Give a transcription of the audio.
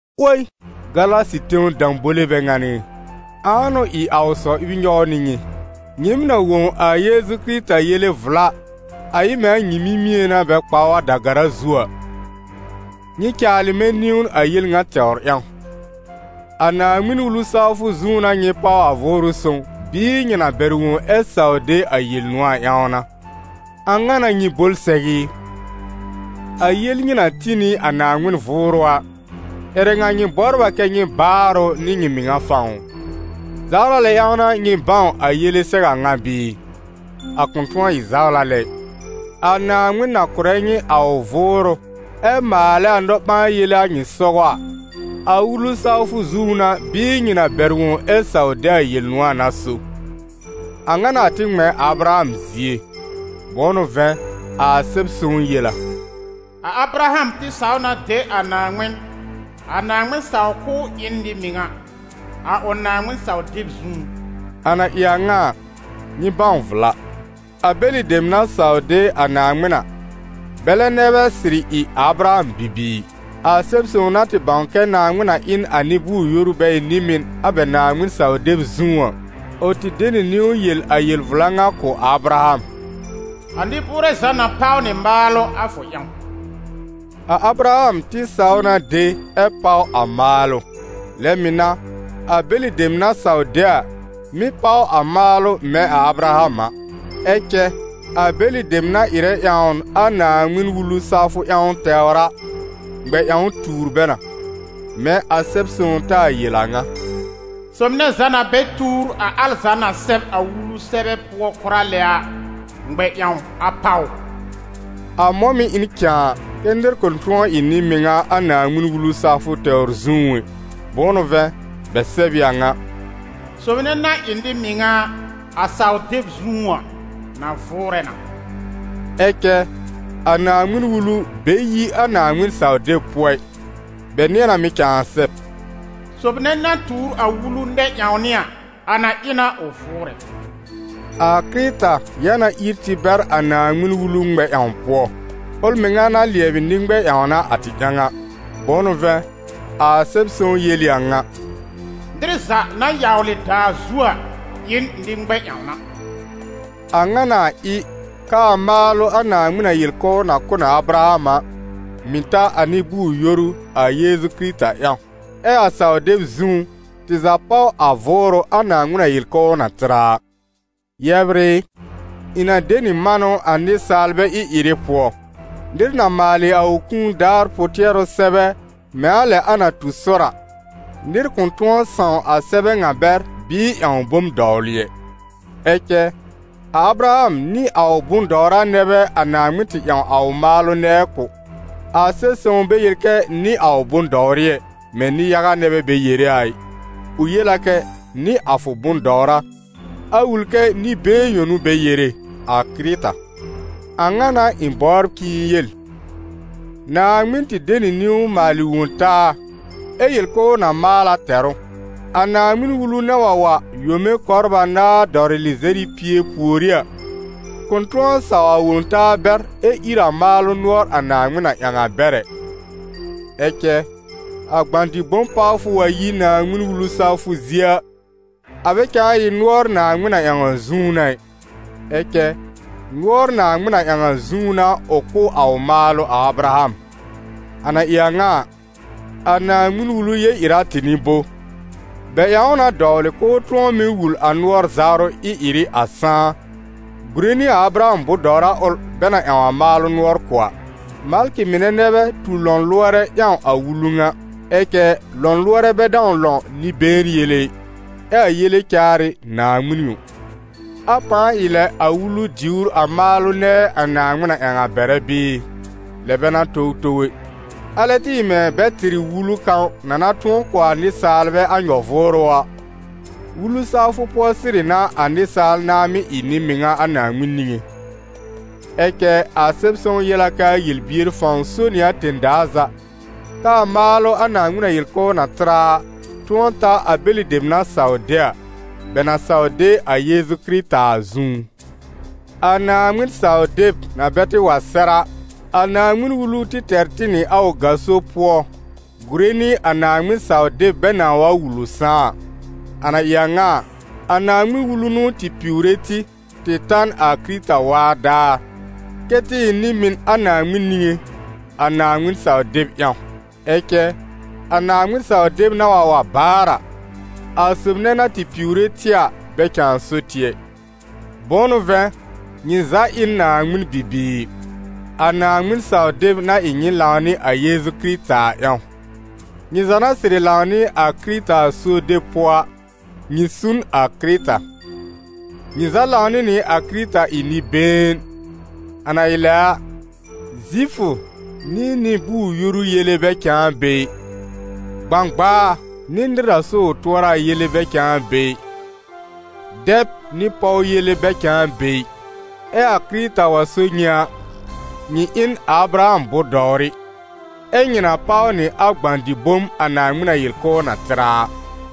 'Woi Galasi tẽw dãbole bɛ ŋan ɩ! Ãa n'ʋ ɩ a ʋ sɔ-ɩb nyɔw nɩ nyɩ? Nyɩɩm na wõ a Yeezu Kɩrɩta yele vla, a ɩ mɛ̃ a nyɩ mímié n'a bɛ kpa ʋ a da-gara zu a? Nyɩ caalɩ mɛ̃ niwn a yel ŋa tɛwr ƴãw: a Naaŋmɩn-Wulu sawfʋ zũú n'a nyɩ páw a Vʋʋrʋ Sõw bɩɩ nyɩ na bɛr wõ ɛ saw de a Yel-nʋ̃ɔ̀ a ƴãw n'a? A ŋa n'a nyɩ bol sɛw ɩ? A yel nyɩ na tĩ nɩ a Naaŋmɩn Vʋʋrʋ a, ƴɛrɛ ŋa nyɩ bɔbr a kɛ́ nyɩ baar ʋ nɩ nyɩ mɩŋa fãw ʋ? Zawla lɛ ƴãw n'a nyɩ bãw a yele sɛw a ŋa bɩɩ? A kʋ̃ tʋ̃ɔ ɩ zawla lɛ ɩ. A Naaŋmɩn na kʋ̀rɛ nyɩ a ʋ Vʋʋrʋ ɛ maalɛ a nɔ-ɓãa-yele a nyɩ sɔgɔ a, a Wulu sawfʋ zũú n'a bɩɩ nyɩ na bɛr wõ ɛ saw de a Yel-nʋ̃ɔ̀ a n'a so? A ŋa n'a a tɩ ŋmɛ̃ a Abraham zie. Bʋ̃ʋ n'ʋ vɛ̃, a Sɛb-sõw yel a: «A Abraham tɩ saw na de a Naaŋmɩn, a Naaŋmɩn saw k'ʋʋ ɩ n nɩ-mɩŋa, a ʋ Naaŋmɩn-saw-deb zũú.» A na ɩ a ŋa a, nyɩ bãw vla: a bɛlɩ dem na saw de a Naaŋmɩn a, bɛlɛ nɛ bɛ sɩrɩ ɩ a Abraham bibiir. A Sɛb-sõw na tɩ bãw kɛ Naaŋmɩn na ɩ n a nɩ-bʋʋr-yoru bɛ ɩ nɩ-mɩn a bɛ Naaŋmɩn-saw-deb zũú a, ʋ tɩ de nɩ niwn yel a yel-vla ŋa kʋ̀ a Abraham: «A nɩ-bʋʋrɛ za na páw nɩ maalʋ a fʋ ƴãw.» A Abraham tɩ saw na de ɛ́ páw a maalʋ, lɛ mɩ̀ n'a a bɛlɩ dem na saw de a, mɩ́ páw a maalʋ mɛ̃ a Abraham. Ɛ cɛ a bɛlɩ dem na ɩrɛ ƴãwn a Naaŋmɩn-Wulu sawfʋ ƴãw tɛwr a, ŋmɛ-ƴãw tuur bɛ na; mɛ̃ a Sɛb-sõw taa yel a ŋa: «Sob nɛ za na bɛ tuur a al za na sɛb a Wulu sɛbɛ pʋɔ kʋra lɛ a, ŋmɛ-ƴãw a páw ʋ.» A mɔ̃ mɩ̀ ɩ n cãa kɛ́ nɩr kʋ̃ tʋ̃ɔ ɩ nɩ-mɩŋa a Naaŋmɩn-Wulu sawfʋ tɛwr zũú ɛ. Bʋ̃ʋ n'ʋ vɛ̃, bɛ sɛb ɩ a ŋa: «Sob nɛ na ɩ nɩ-mɩŋa a, a saw-deb zũú a, na vʋʋrɛ na.» Ɛ cɛ a Naaŋmɩn-Wulu bɛ yi a Naaŋmɩn-saw-deb pʋɔ ɩ, bɛ nɩ̃ɛ na mɩ̀ cãa sɛb: «Sob nɛ na tuur a Wulu nɛ-ƴãwnɩ a, a na ɩ na ʋ vʋʋrɛ.» A Kɩrɩta ya na ír tɩ bɛr a Naaŋmɩn-Wulu ŋmɛ-ƴãw pʋɔ, ʋl mɩŋa na lɩɛbɩ nɩ-ŋmɛ-ƴãwna a tɩ ƴãw a. Bʋ̃ʋ n'ʋ vɛ̃, a Sɛb-sõw yel ɩ a ŋa: «Nɩr za na yawlɩ daa zu a ɩ n nɩ-ŋmɛ-ƴãwna.» A ŋa n'a a ɩ, k'aa maalʋ a Naaŋmɩn na yel k'ʋʋ na kʋ̀ n a Abraham a, mɩ̀ ta a nɩ-bʋʋr-yoru a Yeezu Kɩrɩta ƴãw, ɛ́ a saw-deb zũú, tɩ za páw a Vʋʋrʋ a Naaŋmɩn na yel k'ʋʋ na tɩr a a. Yɛbr ɩ, ɩ̃ na de nɩ manʋ a nɩsaalbɛ ɩ-ɩrɩ pʋɔ: nɩr na maalɩ a ʋ kũu daar pʋ-tɩɛrʋ sɛbɛ mɛ̃ a lɛ a na tu sɔr a, nɩr kʋ̃ tʋ̃ɔ sãw a sɛbɛ ŋa bɛr bɩɩ ƴãw bom dɔwlɩ ɛ. Ɛ cɛ, a Abraham nɩ a ʋ bʋ̃-dɔwra nɛ bɛ a Naaŋmɩn tɩ ƴãw a ʋ maalʋ nɛɛ kʋ̀. A Sɛb-sõw bɛ yel kɛ nɩ a ʋ bʋ̃-dɔwrɩ ɛ, mɛ̃ nɩ-yaga nɛ bɛ bɛ yere a ɩ, ʋ yel a kɛ: «Nɩ a fʋ bʋ̃-dɔwra», a wul kɛ nɩ-been yõ n'ʋ bɛ yere, a Kɩrɩta. A ŋa n'a ɩ̃ bɔbr k'ɩ̃ɩ yel: Naaŋmɩn tɩ de nɩ niwn maalɩ Wõ-taa ɛ yel k'ʋʋ na maal a tɛr ʋ. A Naaŋmɩn-Wulu na wa wa yome kɔbr anaar dɔwlɩ lɩzɛr nɩ pie pùorí a, kʋ̃ tʋ̃ɔ sãw a wõ-taa bɛr ɛ ír a maalʋ nʋɔr a Naaŋmɩn na ƴãw a bɛr ɛ. Ɛ cɛ, a gbã-dɩ-bom pawfʋ wa yi Naaŋmɩn-Wulu sawfʋ zie a, a bɛ cãa ɩ nʋɔr Naaŋmɩn na ƴãw a zũú n'a ɩ; ɛ cɛ nʋɔr Naaŋmɩn na ƴãw a zũú n'a ʋ kʋ̀ a ʋ maalʋ a Abraham. A na ɩ a ŋa a, a Naaŋmɩn-Wulu yel-ɩra tɩ n'ɩ bo? Bɛ ƴãw ʋ na dɔwlɩ k'ʋʋ tʋ̃ɔ mɩ́ wul a nʋɔr-zawrʋ ɩ-ɩrɩ a sãá, gùre nɩ a Abraham bʋ̃-dɔwra ʋl bɛ na ƴãw a maalʋ nʋɔr kʋ̀ a. Malkɩ mɩnɛ nɛ bɛ tu lɔ̃lʋɔrɛ ƴãw a Wulu ŋa. Ɛ cɛ lɔ̃lʋɔrɛ bɛ dãw lɔ̃ nɩ-been yele ɩ. Ɛ a yele caar ɩ Naaŋmɩn yõ. A pãa ɩ lɛ a Wulu diwr a maalʋ nɛɛ a Naaŋmɩn na ƴãw a bɛrɛ bɩɩ? Lɛ bɛ n'a towtow ɛ! Alɛ tɩ ɩ mɛ̃ bɛ tɩr ɩ wulu kãw na na kʋ̀ a nɩsaalbɛ a nyɔ-vʋʋrʋ a, wulu sawfʋ pʋɔ sɩrɩ n'a a nɩsaal nãa mɩ́ ɩ nɩ-mɩŋa a Naaŋmɩn niŋé. Ɛ cɛ a Sɛb-sõw yel a k'aa yel-bier fãw so nɩ a tẽ-daa za, k'aa maalʋ a Naaŋmɩn na yel k'ʋʋ na tɩr a a, tʋ̃ɔ ta a bɛlɩ dem na saw de a, bɛ na saw de a Yeezu Kɩrɩta a zũú. A Naaŋmɩn-saw-deb na bɛ tɩ wa sɛr a, a Naaŋmɩn-Wulu tɩ tɛr tɩ nɩ a ʋ gaso pʋɔ gùre nɩ a Naaŋmɩn-saw-deb bɛ nãa wa wul ʋ sãá a. A na ɩ a ŋa a, a Naaŋmɩn-Wulu n'ʋ tɩ piwre tɩ, tɩ ta n a Kɩrɩta waa daar, kɛ́ tɩ ɩ nɩ-mɩn a Naaŋmɩn niŋé, a Naaŋmɩn-saw-deb ƴãw. Ɛ cɛ a Naaŋmɩn-saw-deb na wa wa baar a, a sob nɛ na tɩ piwre tɩ a bɛ cãa so tɩ ɛ. Bʋ̃ʋ n'ʋ vɛ̃, nyɩ za ɩ n Naaŋmɩn bibiir, a Naaŋmɩn-saw-deb na ɩ nyɩ lãw nɩ a Yeezu Kɩrɩta a ƴãw. Nyɩ za na sɩrɩ lãw nɩ a Kɩrɩta a suob deb pʋɔ a, nyɩ su n a Kɩrɩta. Nyɩ za lãw nɩ nɩ a Kɩrɩta ɩ nɩ-been, a na ɩ lɛ a, Zifʋ nɩ nɩ-bʋʋr-yoru yele bɛ cãa be ɩ, gbãgbaa nɩ nɩr na so ʋ tʋɔra a yele bɛ cãa be ɩ, dɛb nɩ pɔw yele bɛ cãa be ɩ. Ɛ a Kɩrɩta wa so nyɩ a, nyɩ ɩ n a Abraham bʋ̃-dɔwrɩ, ɛ́ nyɩ na páw nɩ a gbã-dɩ-bom a Naaŋmɩn na yel k'ʋʋ na tɩr a a.